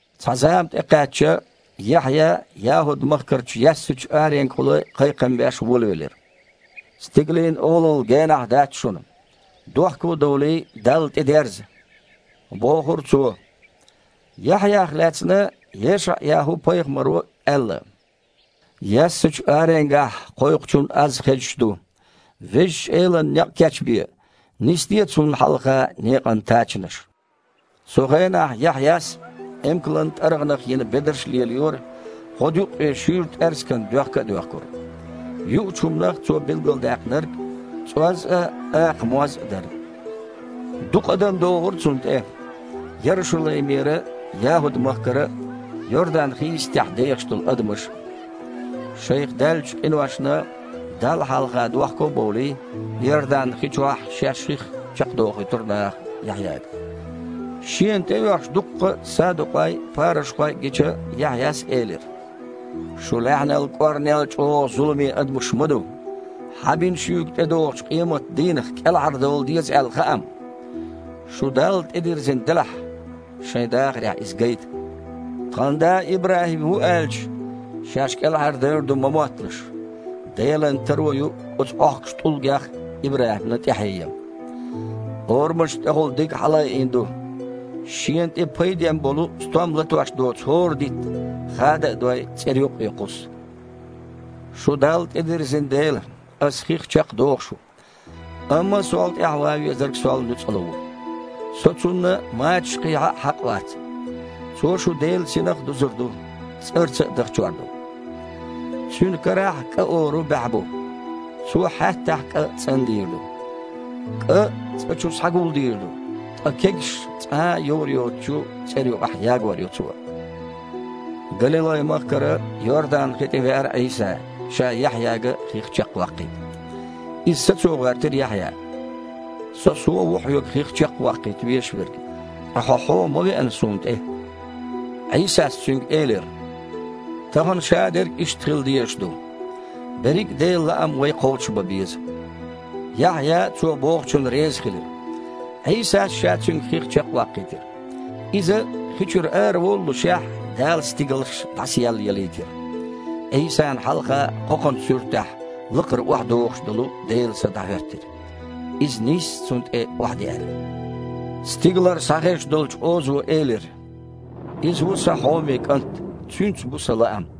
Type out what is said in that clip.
Цхьа зама тІекхаьчча, Яхьъя ЯхІуд-махкарчу яьссачу аренгахула кхайкхам беш волавелира. «Стигалийн Олалла генахь дац шуна! Дохко а довлий, Далла тІедерза!» – бохура Цо. Яхьъях лаьцна ЕшаІ-ЯхІу-пайхамаро аьлла: «Яьссачу аренгахь кхойкхучун аз хезаш ду: Везачу Элана некъ кечбе! Нисде Цунна хьалха некъан тачанаш!» Цу хенахь Яхьъяс эмкалан тІаргІанах йина бедарш а лелайора, гІодаюккъе шуьйра тІаьрсиган доьхка а доьхкура. Юучу хІуманах цо билгалдаьккхинарг цІоз а, акха моз а дара. Дукха адам догІура цунна тІе: Ярушалаймера а, ЯхІуд-махкара а, Йордан-хи йистехь дехаш долу адамаш а. Шайх даьллачу къиношна Далла хьалха дохко а бовлий, Йордан-хи чохь шаьш хих чекхдохуьйтура наха Яхьъяга. Шена тІеоьхуш дуккха а садукъой а, парушхой а гича, Яхьъяс элира: «Шу лаьхьанан кІорнел а чІогІа зуламе адамаш ма ду! Хьан бина шуьга, тІедогІучу къематан дийнах кІелхьардовла деза аьлла, хаам? Шу Далла тІедирзина делахь, шайн дахарехь иза гайта. „Тхан да ИбрахІим ву“, – аьлча, шаьш кІелхьардевр ду ма мотталаш. Делан таро ю оцу Іохкучу тІулгех а ИбрахІимна тІаьхье ян. Орамашна тІехула диг хьалаайина ду: шена тІе пайден болу стом латош доцу хІора дитт, хада а дой, цІера юккъе кхуссу. Шу Далла тІедирзина дела, Ас хих чекхдоху шу, амма сол тІаьхьа ван везарг сол нуьцкъала ву. Со Цунна мачаш кхехьа а хьакъ вац. Цо шу Делан Синах а дузур ду, цІарца а дахчор ду. Цуьнан карахь кІа ору баьхьа бу. Цо хьаьттахь кІа цІандийр ду. КІа цІа чу схьагулдийр ду, ткъа кегаш цкъа а дІайовр йоцучу цІера юкъахь ягор ю Цо». Галилай-махкара Йордан-хи тІе веара Іийса, Ша Яхьъяга хих чекхваккхийта. Иза сацо гІоьртира Яхьъя: «Со-суо ву Хьоьга хих чекхваккхийта везаш верг. Ткъа Хьо-Хьуо ма веана суна тІе?» Іийсас цуьнга элира: «Тахана шадерг а иштта хила дезаш ду. Берриг а Делан лаам вай кхочушбан беза». Яхьъя Цо бохучунна резахилира. Іийсас Ша цуьнга хих чекхваккхийтира. Иза хи чуьра араволлушехь, Дала стигалш дІасаеллаялийтира. Іийсана хьалха кхокханан суьртехь лакхара охьадогІуш долу Делан Са дІахІоьттира. Иза нийсса Цунна тІе охьадеара. Стигалара схьахезаш долчу озо элира: «Иза ву Сан хьоме КІант! Цуьнца бу Сан лаам!»